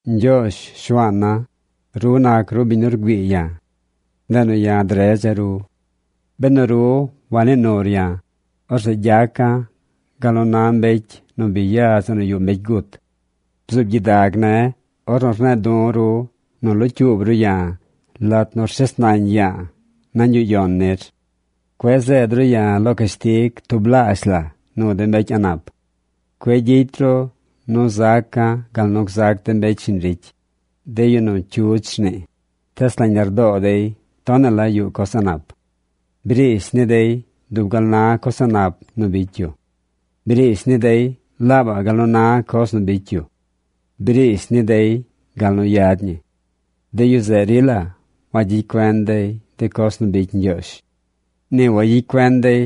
Ñgyoozh, Shuaana̱, ru nac ru biñ nu rgüii ya̱. Ndeꞌ nu ya̱ dredza̱ ru. Benu ru wanii nur ya̱, orzeꞌ gyaca̱ gal nu na mbecy nu bi ya zeꞌ nu yuꞌ mbecy gut. Bzuub gyidag ne̱ ornu rne̱e̱ du̱ ru nu locyuub ru ya̱ lat nu shes nañ ya̱a̱ nañ yuꞌ yon nir. Cueꞌ zeed ru ya̱ lo cashtig tublaazh la nu de mbecy a̱ꞌ nap. Cueꞌ gyicy ru zaca̱ gal nu gzac de mbecy shiñ ricy, de yu nu cyudz rnii, tees nañ lardoo dey tonaꞌ la yuꞌ coz a̱ꞌ nap. Briish ni dey dub gal na coz a̱ꞌ nap nu bicy yu. Briish ni dey laabaꞌ gal nu na coz nu bicy yu. Briish ni dey gal nu yad ñi. De yu zeꞌ rila wagyicy cuen dey de coz nu bicy Ñgyoozh. Ni wayicy cuen dey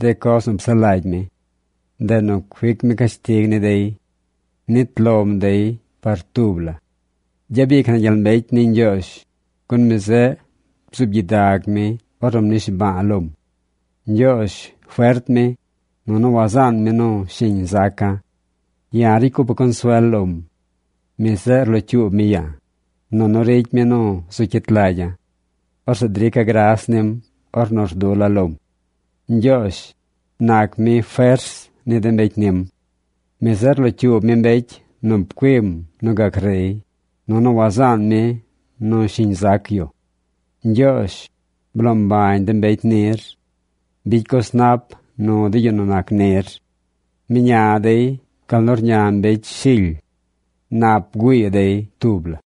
de coz nu psaꞌ lagy mi. Ndeꞌ nu cuic mi cashtig ni dey. Nit lom dey par tub la. Gyabic na gyel mbecy ni Ñgyoozh, gun mi zeꞌ bzuub gyidag mi ornu mnishba̱a̱ lom. Ñgyoozh fert mi, nunu wazaan mi nu shiñ zaca̱. Ya̱ ricy cupa̱ consuel lom. Mi zeꞌ rlocyuub mi ya̱, nunu ricy mi nu zu cyit lagya̱. Orzeꞌ drica̱ gras nim ornu rdula̱ lom. Ñgyoozh, nac mi fers ni de mbecy nim. Mi zeꞌ rlocyuub mi mbecy nu pcuim nu gac rey, nunu wazaan mi nu shiñ zac yu. Ñgyoozh, bloo mbañ de mbecy nir. Bicy coz nap nu de yu nu nac nir. Mña dey gal nu rña mbecy shily. Nap bgüii dey tub la.